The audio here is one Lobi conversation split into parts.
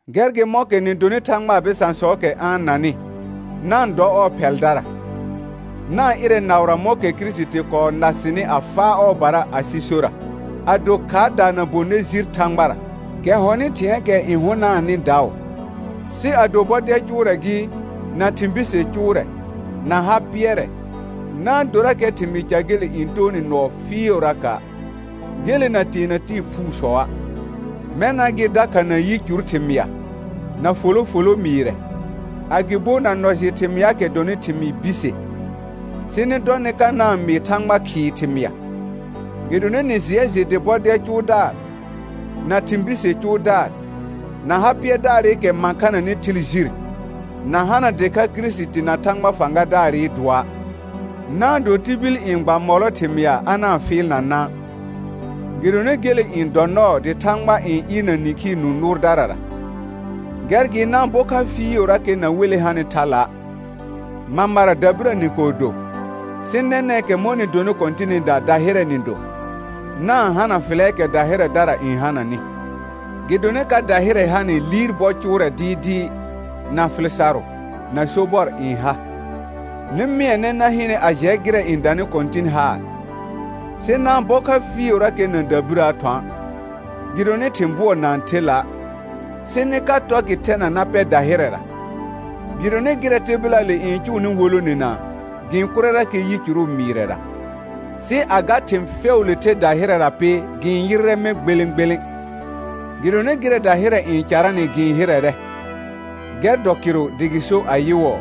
Gɛr gɩ mɔ̃kɛ nɩ donɩ Thagbaa bɩsãsɔɔkɛ a-n nanɩ, na-n dɔ ɔɔ phɛldara. Na-n ɩrɛ naʋra mɔ̃kɛ Kirisiti kɔɔ na sɩnɩ a faa ɔɔbara asɩ sora, a do khaardaa na bonɩ jir Thãgbara, kɛ hɔnɩ thɩ̃ɛɛkɛ n hʋnaanɩ daʋ. Sɩ ado bɔdɛl cʋʋrɛ gɩ, na thɩ̃ bise cʋʋrɛ, na ha pɩɛrɛ, na-n dorakɛ thɩmɩɩ ca gele n too nɩ nɔɔ fɩɩʋraka', gele na teena tɩɩ phuusɔa'; mɛna gɩ dakha na yicur thɩmɩa, na folo folo mɩɩrɛ, agɩbo na nɔ jɩ thɩmɩaakɛ dɔnɩ thɩmɩɩ bise, sɩ dɔ nɩ ka na-n mɩɩ Thãgbaa khɩɩ thɩmɩa. Gɩdonɩ nɩ jɩɛ jɩ dɩ bɔdɛl cʋʋdaar, na thɩ̃ bise cʋʋdaar, na ha pɩɛrdaarɩkɛ mãkhananɩ thɩl jir, na hana dɩkha Kirisiti na Thãgba fãgadaarɩ dʋɔa'. Na-n do tibil n gba mɔlɔ thɩmɩa a na-n fɩɩlna na', gɩdonɩ gele n dɔ nɔɔ dɩ Thãgba n ɩɩrna nĩkhii nũ nʋʋrdarara. Gɛr gɩ na-n bɔ kha fɩɩʋrakɛ na wele hanɩ thala'. Mamara dabirə nɩ kɔɔ do, sɩ nɛnɛ̃kɛ mɔ̃ nɩ donɩ Kɔ̃tɩnɩda dahɩrɛ nɩ do. Na-n hana fɩlɛɛkɛ dahɩrɛdara n hananɩ, gɩdonɩ ka dahɩrɛ hanɩ liir bɔ cʋʋrɛ dɩɩdɩɩ, na fɩl sarʋ, na sobɔr n ha. Nɩ mɩɛnɛ na hɩnɛ a jɛ gɩrɛ n danɩ Kɔ̃tɩn haar; sɩ na-n bɔ kha fɩɩʋrakɛ na dabirəə thɔ̃a', gɩdonɩ thɩ̃ bʋɔ na-n the la', sɩ nɩ ka tɔ gɩ thɛna na pɛ dahɩrɛra. Gɩdonɩ gɩrɛ tɩbɩlaale n cʋʋnɩ wolonena, gɩ-n kʋrɛrakɛ yicuru mɩɩrɛra. Sɩ a ga thɩ̃ fɛʋʋle the dahɩrɛra pɩ gɩ-n yɩrrɛ mɛ̃ gbelẽ gbelẽ, gɩdonɩ gɩrɛ dahɩrɛ n caranɩ gɩ-n hɩrɛrɛ. Gɛr dɔ kɩrʋ dɩ gɩ so ayɩwɔɔ: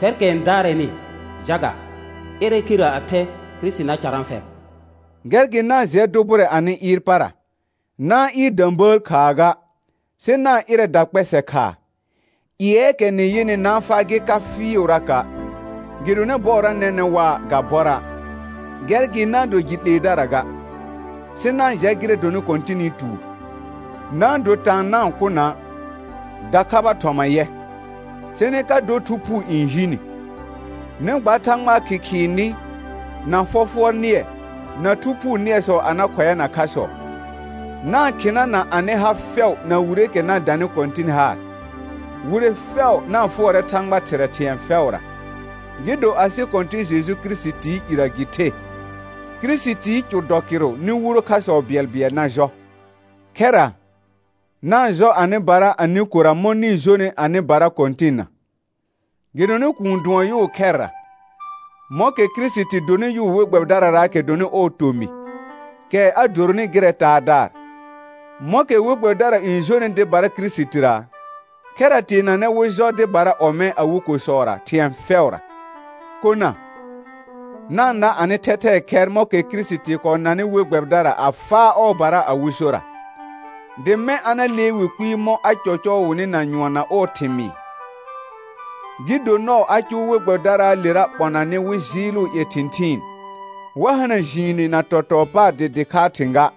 «Fɛrkɛ n daarɛnɩ, jaga, ɩrɛ kherə a thɛ, Kirisiti na carã fɛr.» Gɛr gɩ na-n jɩɛ dʋ bʋrɛ anɩ ɩɩr para, na-n ɩɩr də̃bəəl khaa ga, sɩ na-n ɩrɛ dakpɛsɛ khaa. Ƴɩɛɛkɛ nɩ yɩnɩ na-n faa gɩ ka fɩɩʋraka', gɩdonɩ bɔɔra nɛnɛ̃ waa ga bɔra'. Gɛr gɩ na-n do jɩ 'leedara ga, sɩ na-n jɛ gɩrɛ dɔnɩ Kɔ̃tɩnɩ tuur. Na-n do taan na-n kʋ na', dakhaba thɔma yɛ, sɩ nɩ ka dɔ Thu Phuu n hi ni. Nɩ gba Thãgbaa khɩkhɩɩ nɩ, na fɔfʋɔr nɩɛ, na Thu Phuu nɩɛsɔ a na khʋɛana khasɔ. Na-n khɩna na anɩ ha fɛʋ na wireekɛ na danɩ Kɔ̃tɩn haar. Wire fɛʋ na-n fʋɔrɛ Thãgba Thɩrɛ thɩ̃ɛ fɛʋra, gɩ do asɩ Kɔ̃tɩ̃ Jeju Kirisitii irə gɩ the. Kirisitii cʋ dɔ kɩrʋ nɩ wuro khasɔ bɩɛlbɩɛl na jɔ. Khɛra, na-n jɔ anɩbara anɩ kora mɔ̃ nɩ-n jonɩ anɩbara Kɔ̃tɩnna. Gɩdonɩ kuun dʋɔn yʋʋ khɛrra, mɔ̃kɛ Kirisiti donɩ yʋʋ we gbɛbɩdararaakɛ dɔnɩ ɔɔ tomɩ, kɛ a doronɩ gɩrɛ Taadaar. Mɔ̃kɛ we gbɛbɩdara n jonɩ dɩbara Kirisitira, khɛra teenanɛ wɩ jɔ dɩbara ɔmɛ̃ awɩ kosɔra thɩ̃ɛ fɛʋra. Kona, na-n na anɩ thɛthɛɛ khɛr mɔ̃kɛ Kirisiti kɔɔ nanɩ we gbɛbɩdara a faa ɔɔbara awɩ sora, dɩ mɛ̃ a na lee wɩ kpɩɩ mɔ̃ a cɔcɔɔ wɩnɩ na nyʋɔn na ɔɔ thɩmɩɩ, gɩ do nɔɔ a cʋʋ we gbɛbɩdaraalera ɓɔnanɩ wɩ jɩɩlʋʋ ƴɛ thɩ̃thɩɩn, wa hana jiine na tɔtɔɔ paar dɩ dɩkhaa thɩ̃ ga,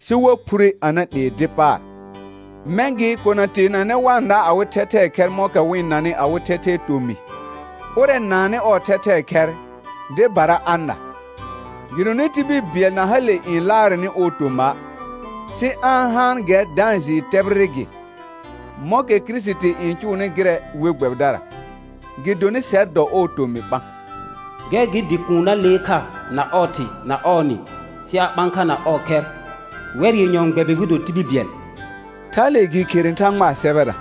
sɩ wa phure a na 'lee dɩ paar. Mɛ̃ gɩ kona teenanɛ wa-n na awɩ thɛthɛɛ khɛr mɔ̃kɛ wɩ-n nanɩ awɩ thɛthɛɛ tomɩ. Ʋrɛ naannɩ ɔɔ thɛthɛɛ khɛr, dɩbara a na. Gɩdonɩ tibil bɩɛl na hale n laarɛnɩ ɔɔ toma', sɩ a-n haan gɛr da-n jɩɩ tɛbɩrɩ gɩ, mɔ̃kɛ Kirisiti n cʋʋnɩ gɩrɛ we gbɛbɩdara, gɩdonɩ sɛr dɔ ɔɔ tomɩ ɓã. «Gɛr gɩ dɩ kuun na lee kha na ɔɔ thɩ na ɔɔ nɩ sɩ a ɓã kha na ɔɔ khɛr, wɛr yenyɔ n gbɛbɩ wɩ do tibil bɩɛl», thale gɩ khere Thãgbaa sɛbɛra.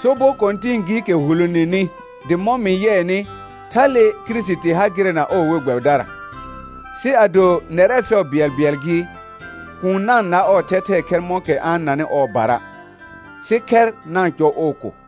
Sobɔ kɔ̃tɩ̃ɩ gɩɩkɛ huloneni dɩ mɔ̃ mɩ yɩɛnɩ, thale Kirisiti ha gɩrɛ na ɔɔ we gbɛbɩdara. Sɩ ado nɛrɛ fɛʋ bɩɛlbɩɛl gɩ, kuun na-n na ɔɔ thɛthɛɛ khɛr mɔ̃kɛ a-n nanɩ ɔɔbara, sɩ khɛr na-n cɔ ɔɔ ko.